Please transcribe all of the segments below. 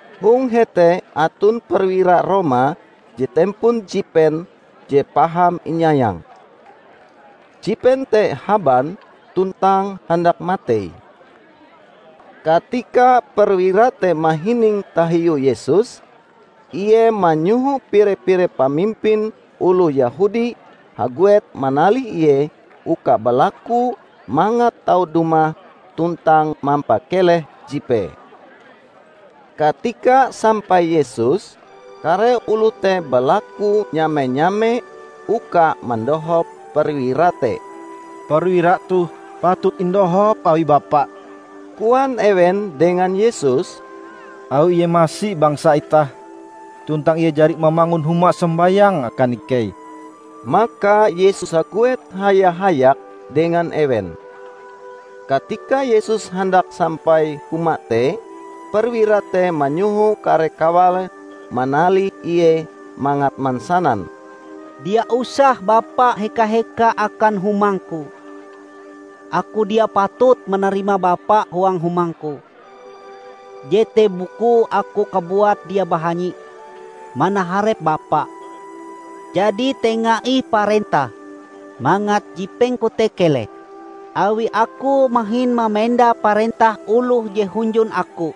Hong hete aton perwira Roma je tempon jipen je paham inyayange. Jipen te haban tuntang handak matei. Katika perwira te mahining tahiu Yesus, ie manyoho pire-pire pamimpin oloh Yehudi haguet manalih Ie uka balaku mangat tau dumah tuntang mampakeleh jipee. Katika sampai Yesus, kare oloh te balaku nyame-nyame uka mandohop perwira te. "Perwira toh patut indohop awi Bapa," koan ewen dengan Yesus, "awi ie masi bangsa itah tuntang ie jari mamangun huma sombayang akan ikei." Maka Yesus haguet haya-hayak dengan ewen. Katika Yesus handak sampai huma te, perwira te manyoho kare kawale manalih Ie mangat mansanan, "Dia usah Bapa heka-heka akan humangku. Aku dia patut manarima Bapa huang humangku. Jete bukue aku kabuat dia bahanyi manaharep Bapa. Jadi tenga ih parentah mangat jipengku te keleh. Awi aku mahin mamenda parentah oloh je hunjun aku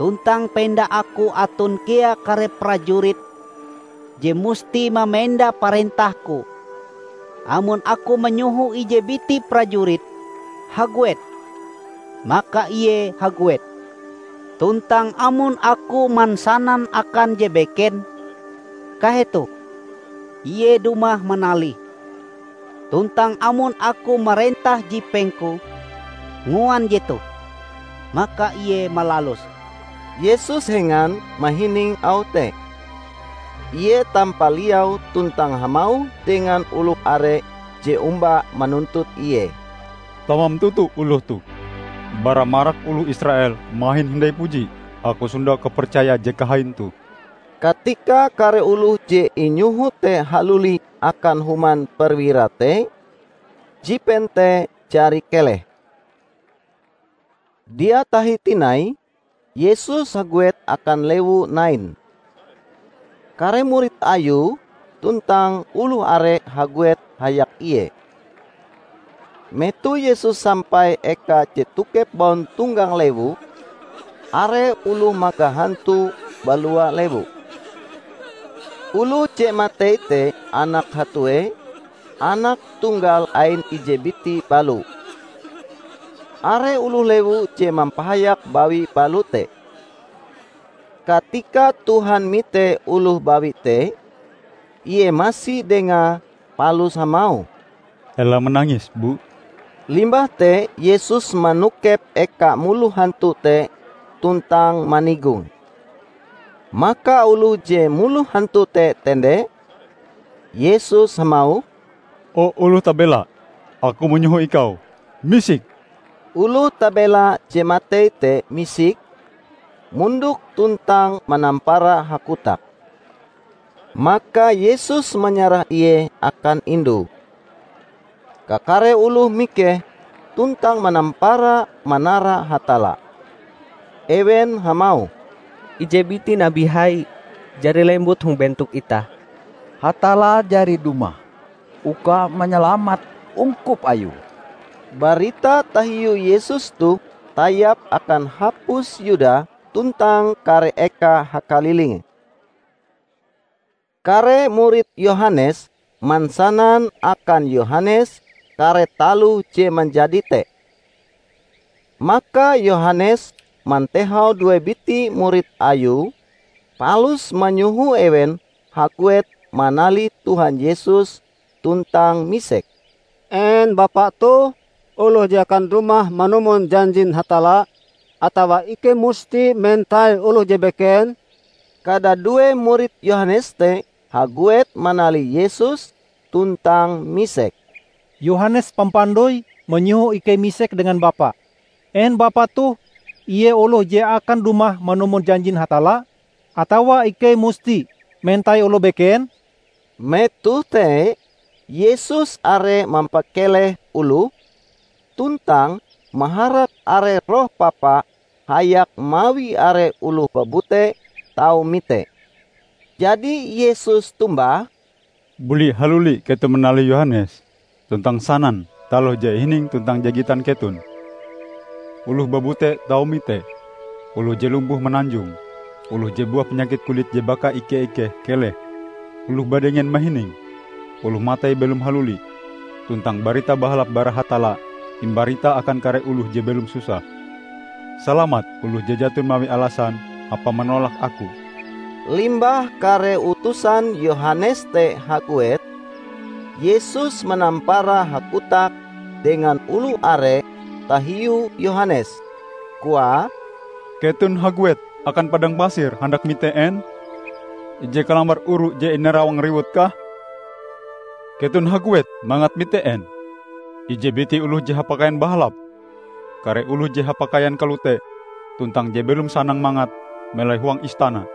tuntang penda aku aton kea kare prajurit je musti mamenda parentahku. Amon aku manyoho ije biti prajurit, 'Haguet!' maka ie haguet; tuntang amon aku mansanan akan je beken, 'Kahetoh!' ie dumah manalih. Tuntang amon aku marentah jipengku, 'Nguan jetoh!' maka ie malaluse." Yesus hengan mahining auh te. Ie tampaliau tuntang hamauh dengan oloh are je omba manuntut Ie, "Tamam toto oloh toh. Bara marak oloh Israel mahin hindai puji Aku sondau kapercaya je kahain toh!" Katika kare oloh je inyoho te haluli akan human perwira te, jipen te jari keleh. Dia tahi tinai, Yesus haguet akan lewu Nain. Kare murid Ayue tuntang oloh are haguet hayak Ie. Metoh Yesus sampai eka je tokep bauntonggang lewu, are oloh magah hantu balua lewu. Oloh je matei te anak hatue, anak tunggal ain ije biti balo. Are oloh lewu je mampahayak bawi balo te. Katika Tuhan mite oloh bawi te, ie masi dengae palus hamauh, "Ela manangis, bu!" Limbah te Yesus manokep eka muloh hantu te tuntang manigonge. Maka oloh je muloh hantu te tende, Yesus hamauh, "O oloh tabela, Aku manyoho ikau misik!" Oloh tabela je matei te misik, mondok tuntang manampara hakotak. Maka Yesus manyarah ie akan indue. Kakare oloh mikeh tuntang manampara manara Hatalla. Ewen hamauh, "Ije biti nabi hai jari lembut hong bentok itah! Hatalla jari dumah uka manyalamat ungkup Ayue!" Barita tahiu Yesus toh tayap akan hapus Yuda tuntang kare eka hakalilinge. Kare murid Yohanes mansanan akan Yohanes kare taloh je manjadi te. Maka Yohanes mantehau due biti murid Ayue, palus manyoho ewen haguet manalih Tuhan Yesus tuntang misek, "En Bapa toh oloh je akan dumah manumon janjin Hatalla, atawa ikei musti mentai oloh je beken?" Kadadue murid Yohanes te haguet manalih Yesus tuntang misek, "Yohanes Pampandoi manyoho ikei misek dengan Bapa, en Bapa toh ie oloh je akan dumah manumon janjin Hatalla, atawa ikei musti mentai oloh beken?" Metoh te, Yesus are mampakeleh oloh, tuntang maharak are roh papa hayak mawi are oloh babute tau mite. Jadi Yesus tombah, "Buli haluli keton manalih Yohanes tuntang sanan taloh je ihining tuntang je gitan keton: oloh babute tau mite, oloh je lumpuh mananjong, oloh je buah panyakit kulit je baka ike-ikeh keleh, oloh badengen mahining, oloh matei belom haluli tuntang Barita Bahalap bara Hatalla imbarita akan kare oloh je belom susah. Salamat oloh je jaton mawi alasan hapae manolak Aku." Limbah kare utusan Yohanes te haguet, Yesus manampara hakotak dengan oloh are tahiu Yohanes, koae, "Keton haguet akan padang pasir handak mite en? Ije kalambar oru je inarawang riwut kah? Keton haguet mangat mite en? Ije biti oloh je hapakaian bahalap? Kare oloh je hapakaian kalote tuntang je belom sanang mangat, melai huang istana!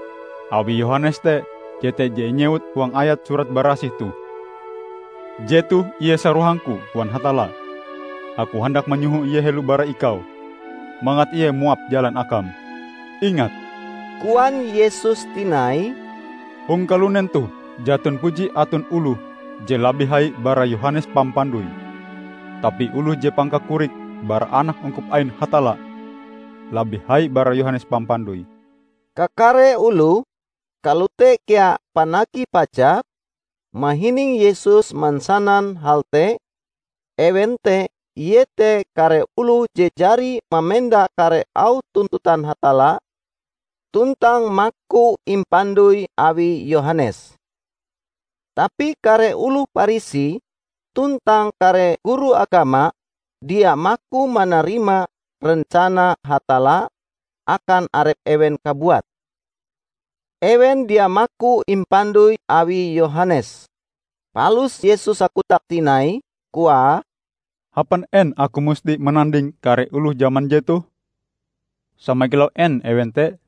Awi Yohanes te, jete je inyewut huang ayat Surat Barasih toh, 'Jetoh ie sarohang-Ku,' koan Hatalla, 'Aku handak manyoho ie helo bara Ikau, mangat ie muap jalan Akam!' " "Ingat," koan Yesus tinai, "hong kalunen toh jaton puji aton oloh je labih hai bara Yohanes Pampandoi. Tapi oloh je pangkakorike bara anak ungkup ain Hatalla, labih hai bara Yohanes Pampandoi." Kakare oloh -- kalote kea panagih pajak -- mahining Yesus mansanan hal te; ewen te iete kare oloh je jari mamenda kare auh tuntutan Hatalla tuntang maku impandoi awi Yohanes. Tapi kare oloh Parisi tuntang kare guru agama dia maku manarima rencana Hatalla akan arep ewen kabuat. Ewen dia maku impandoi awi Yohanes. Palus Yesus hakotak tinai, koae, "Hapan en Aku musti mananding kare oloh jaman jetoh? Sama kilau en ewen te?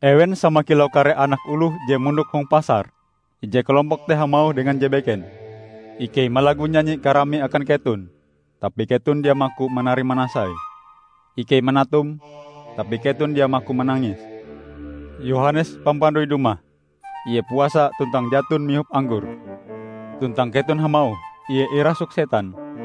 Ewen sama kilau kare anak oloh je mondok hong pasar; ije kalompok te hamauh dengan je beken, 'Ikei malagu nyanyi karami akan keton, tapi keton dia maku manari manasai! Ikei manatum, tapi keton dia maku manangis!' Yohanes Pampandoi dumah -- ie puasa tuntang jaton mihop anggor -- tuntang keton hamauh, 'Ie irasuk setan!'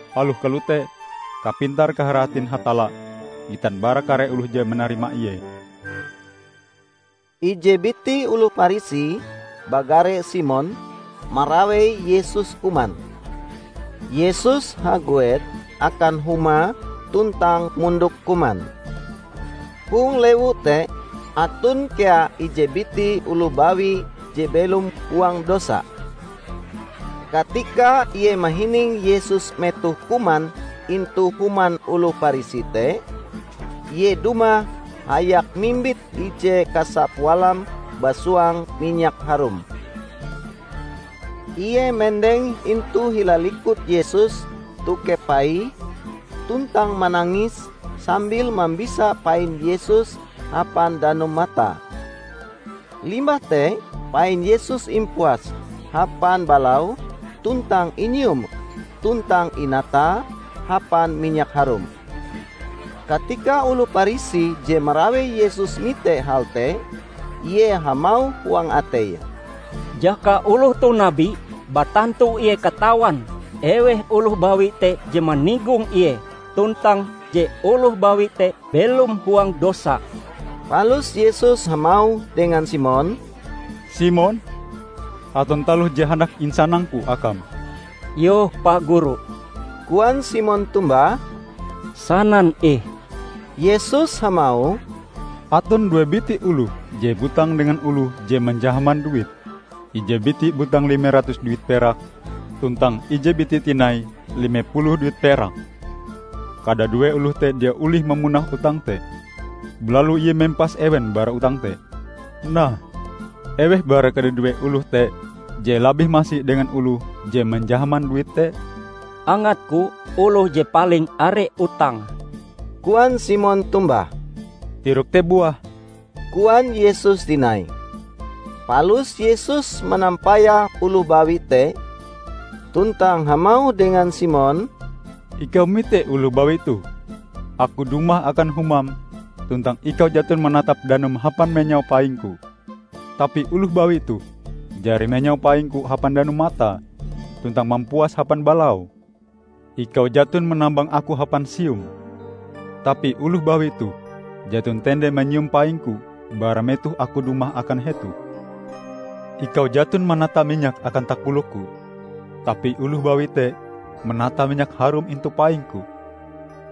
Aloh kalote, kapintar-kaharatin Hatalla gitan bara kare oloh je manarima Ie." Ije biti oloh Parisi, bagare Simon, marawei Yesus kuman. Yesus haguet akan humae tuntang mondok kuman. Hong lewu te aton kea ije biti oloh bawi je belom huang dosa. Katika ie mahining Yesus metohe kuman intu human oloh Parisi te, ie dumah hayak mimbit ije kasa pualam basuang minyak harum. Ie mendeng intu hila likut Yesus tokep paie tuntang manangis sambil mambisa pain Yesus hapan danum matae. Limbah te pain Yesus impuase hapan balaue tuntang inyiume tuntang inatae hapan minyak harum. Katika oloh Parisi je marawei Yesus mite hal te, ie hamauh huang ateie, "Jaka oloh toh nabi, batantu ie katawan eweh oloh bawi te je manigong Ie, tuntang je oloh bawi te belom huang dosa!" Palus Yesus hamauh dengan Simon, "Simon, aton taloh je handak insanang-Ku akam." "Yoh, Pa Guru," koan Simon tombah, "sanan ih." Yesus hamauh, "Aton due biti oloh je butang dengan oloh je manjahaman duit. Ije biti butang lime ratus duit perak, tuntang ije biti tinai lime puluh duit perak. Kadadue oloh te dia olih mamunah utange te, balalu ie mempas ewen bara utang te. Nah, eweh bara kadadue oloh te je labih masi dengan oloh je manjahaman duit te?" "Angatku, oloh je paling are utange!" koan Simon tombah. "Tirokm te buah," koan Yesus tinai. Palus Yesus manampayah oloh bawi te tuntang hamauh dengan Simon, "Ikau mite oloh bawi toh? Aku dumah akan humam, tuntang ikau jaton manatap danum hapan menyau paing-Ku tapi oloh bawi toh jari menyau paing-Ku hapan danum matae, tuntang mampuase hapan balaue. Ikau jaton manambang Aku hapan sium, tapi oloh bawi toh jaton tende manyium paing-Ku bara metoh Aku dumah akan hetoh. Ikau jaton manata minyak akan takolok-Ku, tapi oloh bawi te manata minyak harum intu paing-Ku.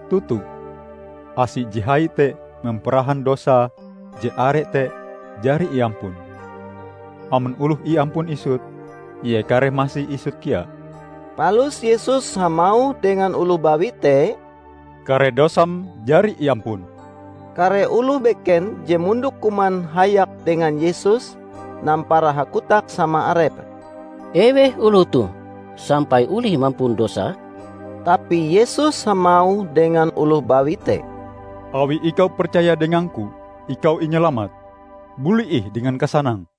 Toto: asie je hai te mamparahan dosae je are te jari iampun! Amon oloh iampun isut, ie kareh masi isut kea." Palus Yesus hamauh dengan oloh bawi te, "Kare dosam jari iampun." Kare oloh beken je mondok kuman hayak dengan Yesus nampara hakotak sama arepe, "Eweh oloh toh sampai olih mampun dosa?" Tapi Yesus hamauh dengan oloh bawi te, "Awi ikau percaya dengang-Ku, ikau inyalamat. Buli ih dengan kasanang!"